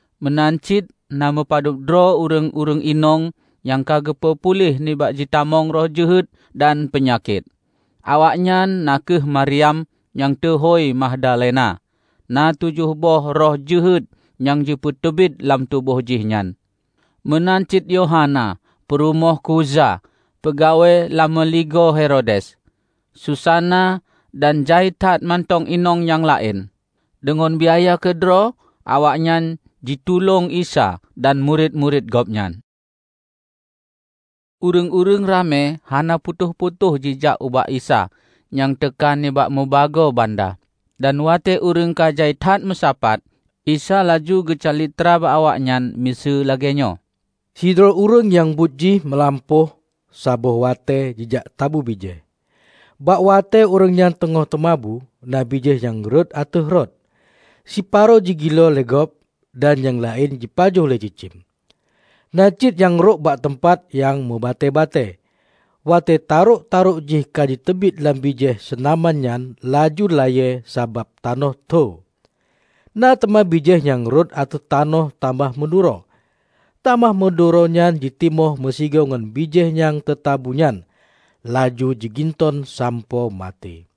Meunan cit na meupadub droe ureuëng-ureuëng inong nyang ka geupeu puléh nibak jitamong roh jeuhet dan peunyakét. Awaknyan na kheueh Maryam nyang teuhôi Magdalena (na tujoh boh roh jeuhet nyang teupeuteubiet lam tuboh jih nyan); meunan cit Yohana, peurumoh Khuza, peugawée lam meuligoe Herodes; Susana, dan jai that mantong inong nyang laén. Deungon biaya keudroe, awaknyan jitulông Isa dan murit-murit Gobnyan. Ureuëng-ureuëng ramé hana putôh-putôh jijak ubak Isa nyang teuka nibak mubagoe banda. Dan watée ureuëng ka jai that meusapat, Isa laju geucalitra bak awaknyan miseue lagée nyoe, "Sidroe ureuëng nyang buet jih meulampôh saboh watée jijak tabu bijéh. Bak watée ureuëng nyan teungoh teumabu, na bijéh nyang rhot ateueh rot. Siparo jigiloe lé gob dan nyang laén jipajoh lé cicém. Na cit nyang rhot bak teumpat nyang mubatée-batée. Watée tarök-tarök jih ka jiteubiet lam bijéh seunaman nyan laju layée sabab tanoh tho. Na teuma bijéh nyang rhot ateueh tanoh tamah meuduro. Tamah meuduro nyan jitimoh meusigoe ngon bijéh nyang teutabu nyan, laju jiginton sampoe maté.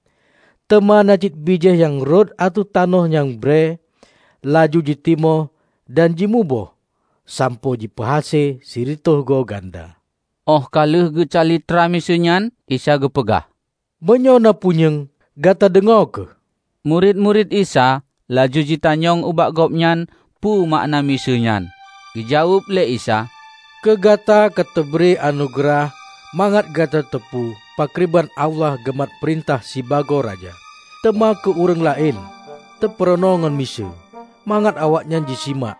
Teuma na cit bijéh nyang rhot ateueh tanoh nyang brée, laju jitimoh dan jimuboh sampoe jipeuhase sireutôh goe ganda." Óh ka lheueh geucalitra miseue nyan, Isa geupeugah, "Meunyoe na punyueng, gata deungoe kheueh!" Murit-murit Isa laju jitanyong ubak Gobnyan peue makna miseue nyan. Geujaweueb lé Isa, "Keu gata ka teubri anugeurah mangat gata teupeu pakriban Allah geumat peurintah sibagoe Raja. Teuma keu ureuëng laén teupeurunoe ngon miseue, mangat awaknyan jisimak,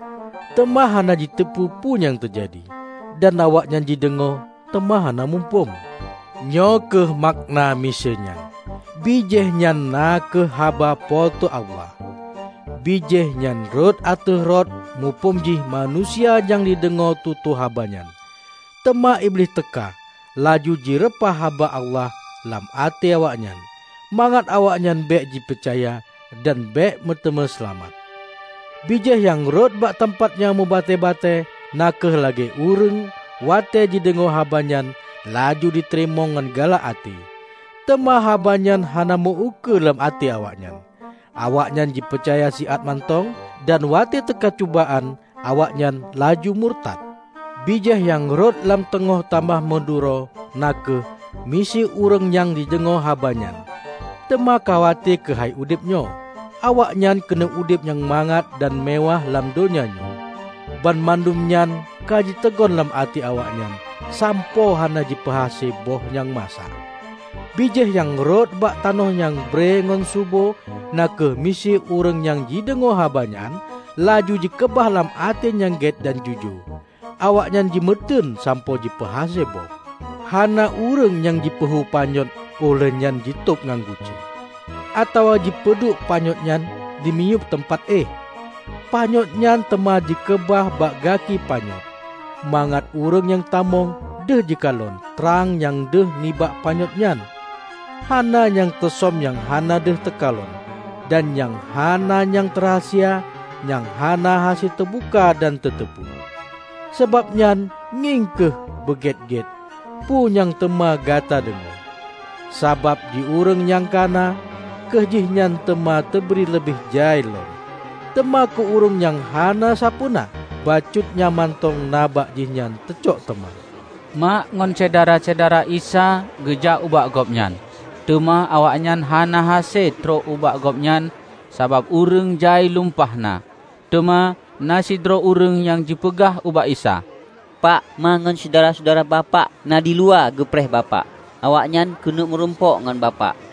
teuma hana jiteupeu peue nyang teujadi; dan awaknyan jideungoe, teuma hana muphom." "Nyoe kheueh makna miseue nyan: Bijéh nyan na kheueh haba Po teu Allah. Bijéh nyan rhot ateueh rot muphom jih manusia nyang jideungoe tutoe haba nyan. Teuma Iblih teuka laju jireupah haba Allah lam até awaknyan, mangat awaknyan bék jipeucaya dan bék meuteumé seulamat. Bijéh nyang rhot bak teumpat nyang meubatée-batée na kheueh lagée ureuëng watée jideungoe haba nyan, laju jiteurimong ngon galak até. Teuma haba nyan hana meu-ukeue lam até awaknyan. Awaknyan jipeucaya siat mantong, dan watée teuka cubaan, awaknyan laju murtat. Bijéh nyang rhot lam teungoh tamah meuduro na kheueh miseue ureuëng nyang jideungoe haba nyan, teuma khawate keuhai udeb nyoe, awaknyan keuneuk udeb nyang mangat dan meuwáh lam donya nyoe. Banmandum nyan ka jiteugon lam até awaknyan sampoe hana jipeuhase boh nyang masak. Bijéh nyang rhot bak tanoh nyang brée ngon subo na kheueh miseue ureuëng nyang jideungoe haba nyan, laju jikeubah lam até nyang gét dan jujoe. Awaknyan jimeuteun sampoe jipeuhase boh." "Hana ureuëng nyang jipeuhu panyöt óh lheueh nyan jitôb ngon guci, atawa jipeuduek panyöt nyan dimiyueb teumpat éh. Panyöt nyan teuma jikeubah bak gaki panyöt, mangat ureuëng nyang tamong deuh jikalon trang nyang deuh nibak panyöt nyan. Hana nyang teusöm nyang hana deuh teukalon; dan nyang hana nyang teurahsia nyang hana hase teubuka dan teuteupeue. Sabab nyan ngieng kheueh beugét-gét peue nyang teuma gata deungoe. Sabab di ureuëng nyang ka na, keu jihnyan teuma teubri leubeh jai lom; teuma keu ureuëng nyang hana sapeue na, bacut nyang mantong na bak jihnyan teucok teuma." Mak ngon syedara-syedara Isa geujak ubak Gobnyan, teuma awaknyan hana hase trok ubak Gobnyan sabab ureuëng jai lumpah na. Teuma na sidroe ureuëng nyang jipeugah ubak Isa, "Pak, Ma ngon syedara-syedara Bapak na diluwa geupreh Bapak. Awaknyan keuneuk meurumpok ngon Bapak."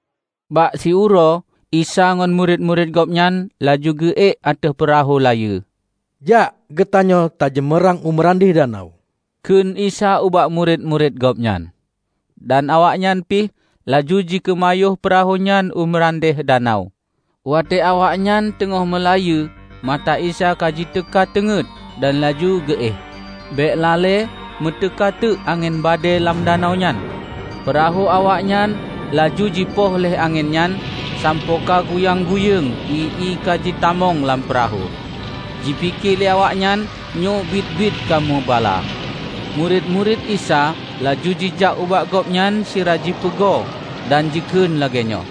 Bak siuroe Isa ngon murit-murit Gobnyan laju geu-ék ateueh peurahô layeue. "Jak geutanyoe tajeumeurang u meurandeh danau," kheun Isa ubak murit-murit Gobnyan. Dan awaknyan pih laju jikeumayôh peurahô nyan u meurandeh danau. Watée awaknyan teungoh meulayeue, mata Isa ka jiteuka teungét dan laju geu éh. Bék lalée meuteuka teuk angén badée lam danau nyan, peurahô awaknyan laju jipoh lé angén nyan sampoe ka guyang gayeng ié-ié ka jitamong lam peurahô, jipike lé awaknyan nyoe biet-biet ka meubala. Murit-murit Isa laju jijak ubak Gobnyan sira jipeugo dan jikheun lagée nyoe,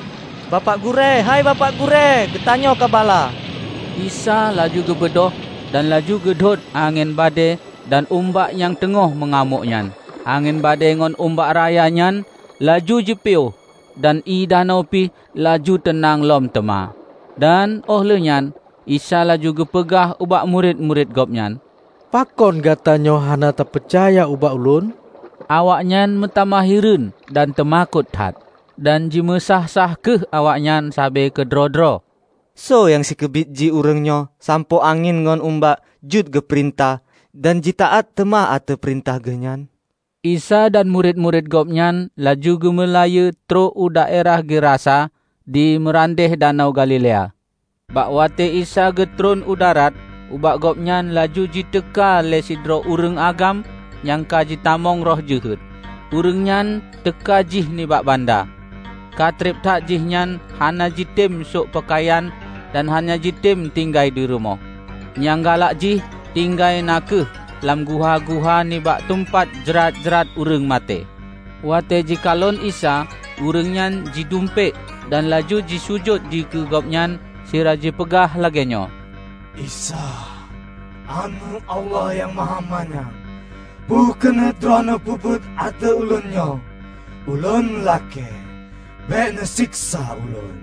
"Bapak Gurée, Hei Bapak Gurée, geutanyoe ka bala!" Isa laju geubeudôh dan laju geudhôt angén badée dan umbak nyang teungoh meungamôk nyan. Angén badée ngon umbak raya nyan laju jipiôh dan ié danau pih laju teunang lom teuma. Dan óh lheueh nyan Isa laju geupeugah ubak murit-murit Gobnyan, "Pakon gatanyoe hana tapeucaya ubak Ulôn?" Awaknyan meutamah hireuen dan teumakot that. Dan jimeusáh-sáh kheueh awaknyan sabe keudroe-droe, "Soe nyang sikeubit jih ureuëng nyoe sampoe angén ngon umbak jeuet geupeurintah dan jitaát teuma ateueh peurintah geuh nyan!" Isa dan murit-murit Gobnyan laju geumeulayeue trok u daerah Gerasa di meurandeh Danau Galilea. Bak watée Isa geutron u darat, ubak Gobnyan laju jiteuka lé sidroe ureuëng agam nyang ka jitamong roh jeuhet. Ureuëng nyan teuka jih nibak banda. Ka treb that jihnyan hana jitem sok peukayan dan hana jitem tinggai dirumoh. Nyang galak jih tinggai na kheueh lam guha-guha nibak teumpat jrat-jrat ureuëng maté. Watée jikalon Isa, ureuëng nyan jidumpék dan laju jisujut dikeue Gobnyan sira jipeugah lagée nyoe, "Isa, Aneuëk Allah Nyang Mahamanyang! Peue keuneuk Droeneueh peubuet ateueh Ulôn nyoe? Ulôn lakée bék neuseksa ulôn!"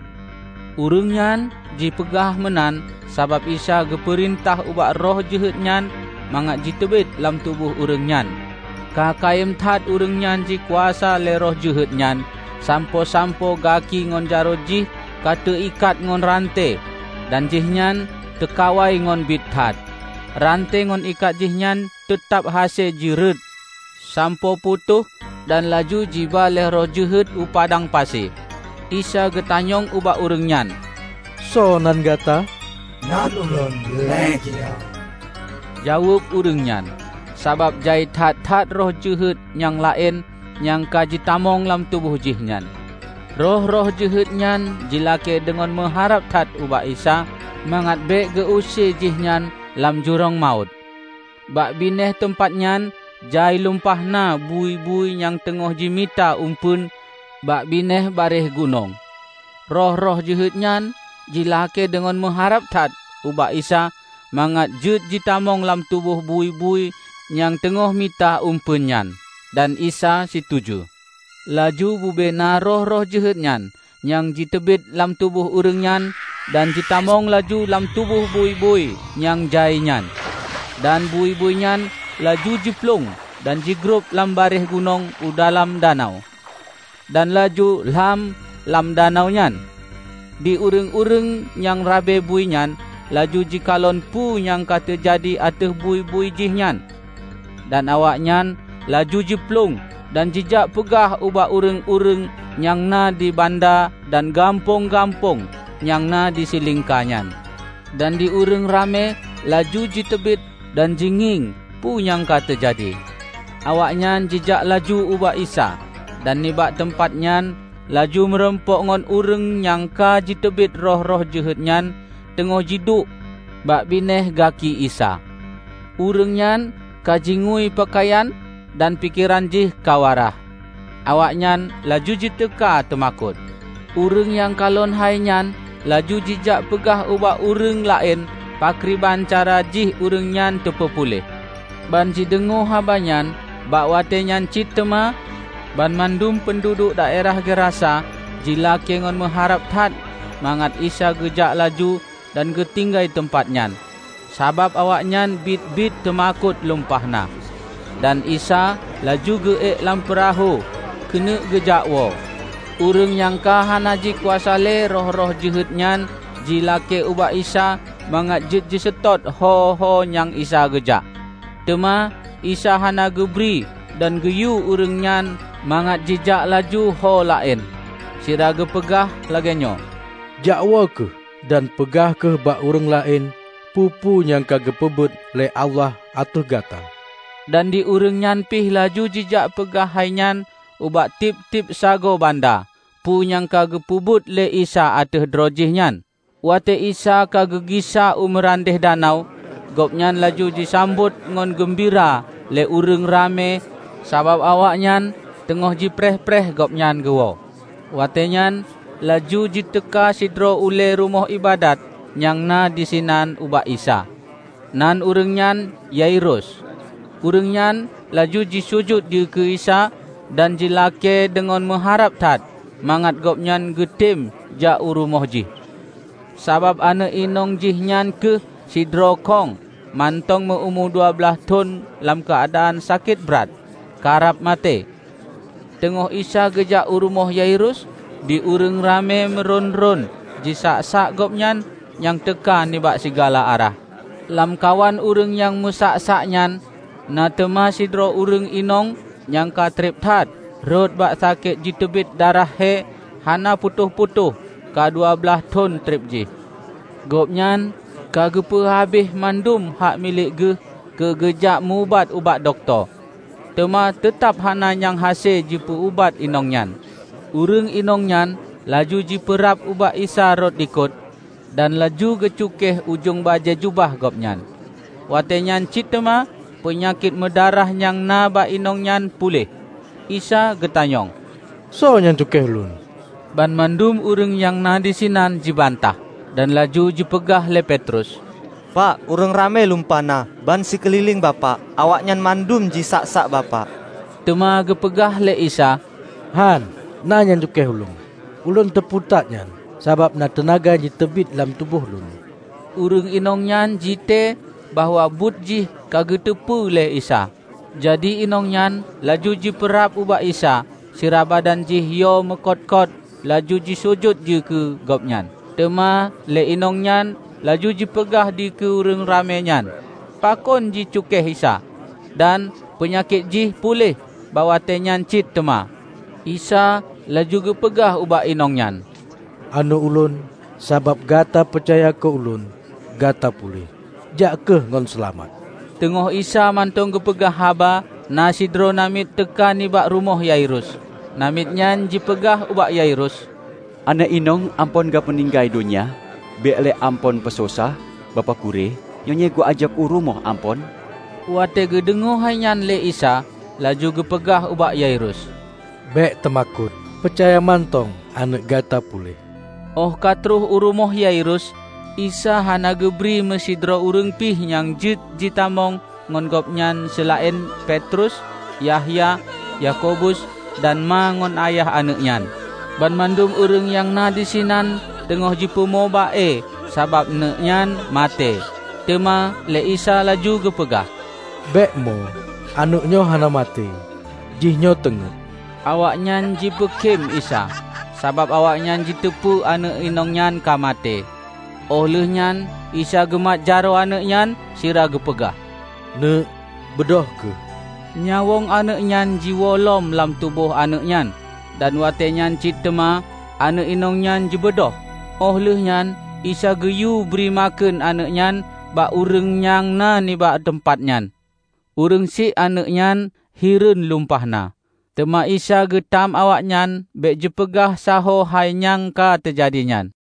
Ureuëng nyan jipeugah meunan sabab Isa geupeurintah ubak roh jeuhet nyan mangat jiteubiet lam tuboh ureuëng nyan. Ka kayém that ureuëng nyan jikuasa lé roh jeuhet nyan sampoe-sampoe gaki ngon jaroe jih ka teuikat ngon rante dan jihnyan teukawai ngon bit that, rante ngon ikat jihnyan teutab hase jireuet sampoe putôh dan laju jiba lé roh jeuhet u padang pasi. Isa geutanyong ubak ureuëng nyan, "Soe nan gata?" "Nan ulôn 'Legiun'," jaweueb ureuëng nyan -- sabab jai that-that roh jeuhet nyang laén nyang ka jitamong lam tuboh jih nyan. Roh-roh jeuhet nyan jilakée deungon meuharab that ubak Isa mangat bék geu-use jihnyan lam Jurông Mawöt. Bak binéh teumpat nyan jai lumpah na bui-bui nyang teungoh jimita eumpeuen bak binéh barieh gunong. Roh-roh jeuhet nyan jilakée deungon meuharab that ubak Isa mangat jeuet jitamong lam tuboh bui-bui nyang teungoh mita eumpeuen nyan. Dan Isa situju. Laju bubena roh-roh jeuhet nyan jiteubiet lam tuboh ureuëng nyan dan jitamong laju lam tuboh bui-bui nyang jai nyan. Dan bui-bui nyan laju jiplueng dan jigrob lam barieh gunong u dalam danau, dan laju lham lam danau nyan. Di ureuëng-ureuëng nyang rabe bui nyan laju jikalon peu nyang ka teujadi ateueh bui-bui jihnyan. Dan awaknyan laju jiplueng dan jijak peugah ubak ureuëng-ureuëng nyang na di banda dan gampông-gampông nyang na di silingka nyan. Dan di ureuëng ramé laju jiteubiet dan jingieng peue nyang ka teujadi. Awaknyan jijak laju ubak Isa, dan nibak teumpat nyan laju meurumpok ngon ureuëng nyang ka jiteubiet roh-roh jeuhet nyan teungoh jiduek bak binéh gaki Isa. Ureuëng nyan ka jingui peukayan dan pikeran jih ka waraih. Awaknyan laju jiteuka teumakot. Ureuëng nyang kalon hainyan laju jijak peugah ubak ureuëng laén pakriban cara jih ureuëng nyan teupeupuléh. Ban jideungoe habanyan bak watée nyan cit teuma banmandum peunduduek daerah Gerasa jilakée ngon meuharab that mangat Isa geujak laju dan geutinggai teumpat nyan, sabab awaknyan biet-biet teumakot lumpah na. Dan Isa laju geu-ék lam peurahô keuneuk geujakwoe. Ureuëng nyang ka hana jikuasa lé roh-roh jeuhet nyan jilakée ubak Isa mangat jeuet jiseutôt ho-ho nyang Isa geujak. Teuma Isa hana geubri dan geuyue ureuëng nyan mangat jijak laju holaén, sira geupeugah lagée nyoe, "Jakwoe kheueh dan peugah kheueh bak ureuëng laén peue-peue nyang ka geupeubuet lé Allah ateueh gata." Dan di ureuëng nyan pih laju jijak peugah hainyan ubak tieb-tieb sagoe banda, peue nyang ka geupeubuet lé Isa ateueh droe jih nyan. Watée Isa ka geugisa u meurandeh danau, Gobnyan laju jisambot ngon geumbira lé ureuëng ramé sabab awaknyan teungoh jipreh-preh Gobnyan geuwoe. Watée nyan laju jiteuka sidroe ulée rumoh iébadat nyang na disinan ubak Isa. Nan ureuëng nyan Yairus. Ureuëng nyan laju jisujut dikeue Isa dan jilakée deungon meuharab that mangat Gobnyan geutem jak u rumoh jih, sabab aneuëk inong jih nyan kheueh sidroe kông mantong meu-umu dua blaih thon lam keuadaan sakét brat karab maté. Teungoh Isa geujak u rumoh Yairus, di ureuëng ramé meurôn-rôn jisak-sak Gobnyan nyang teuka nibak sigala arah. Lamkawan ureuëng nyang meusak-sak nyan na teuma sidroe ureuëng inong nyang ka treb that rhot bak sakét jiteubiet darah hé hana putôh-putôh ka dua blaih thon treb jih. Gobnyan ka geupeu habéh mandum hak milék geuh keugeujak meu-ubat ubak dokto, teuma teutab hana nyang hase jipeu-ubat inong nyan. Ureuëng inong nyan laju jipeurab ubak Isa rot likot, dan laju jicukéh ujong bajée jubah Gobnyan. Watée nyan cit teuma peunyakét meudarah nyang na bak inong nyan puléh. Isa geutanyong, "Soe nyang cukéh Ulôn?" Banmandum ureuëng nyang na disinan jibantah. Dan laju jipeugah lé Petrus, "Pak, ureuëng ramé lumpah na bansikeulileng Bapak; awaknyan mandum jisak-sak Bapak!" Teuma geupeugah lé Isa, "Hán, na nyang cukéh Ulôn. Ulôn teupeu that nyan, sabab na teunaga nyang jiteubiet lam tuboh Lôn." Ureuëng inong nyan jitée bahwa buet jih ka geuteupeue lé Isa. Jadi inong nyan laju jipeurab ubak Isa sira badan jih yo meukot-kot laju jisujut dikeue Gobnyan. Teuma lé inong nyan laju jipeugah dikeue ureuëng ramé nyan, pakon jicukéh Isa, dan peunyakét jih puléh bak watée nyan cit teuma. Isa laju geupeugah ubak inong nyan, "Aneuëk Ulôn, sabab gata peucaya keu Ulôn, gata puléh. Jak kheueh ngon seulamat." Teungoh Isa mantong geupeugah haba, na sidroe namiet teuka nibak rumoh Yairus. Namiet nyan jipeugah ubak Yairus, "Aneuëk inong Amphon ka meuninggai donya. Bék lé Amphon peusosah Bapak Gurée nyoe geujak u rumoh Amphon." Watée geudeungoe hainyan lé Isa, laju geupeugah ubak Yairus, "Bék teumakot. Peucaya mantong aneuëk gata puléh." Óh ka troh u rumoh Yairus, Isa hana geubri meusidroe ureuëng pih nyang jeuet jitamong ngon Gobnyan seulaén Petrus, Yahya, Yakobus dan ma ngon ayah aneuëk nyan. Banmandum ureuëng nyang na disinan teungoh jipeumo ba-e sabab aneuëknyan maté. Teuma lé Isa laju geupeugah, "Bék mo. Aneuëk nyoe hana maté, jihnyoe teungét!" Awaknyan jipeukém Isa, sabab awaknyan jiteupeu aneuëk inong nyan ka maté. Óh lheueh nyan Isa geumat jaroe aneuëk nyan sira geupeugah, "Neuëk, beudôh kheueh!" Nyawöng aneuëk nyan jiwoe lom lam tuboh aneuëk nyan, dan watée nyan cit teuma aneuëk inong nyan jibeudôh. Óh lheueh nyan Isa geuyue bri makheun aneuëk nyan bak ureuëng nyang na nibak teumpat nyan. Ureuëng syiek aneuëk nyan hireuen lumpah na. Teuma Isa geutam awaknyan bék jipeugah sahoe hai nyang ka teujadi nyan.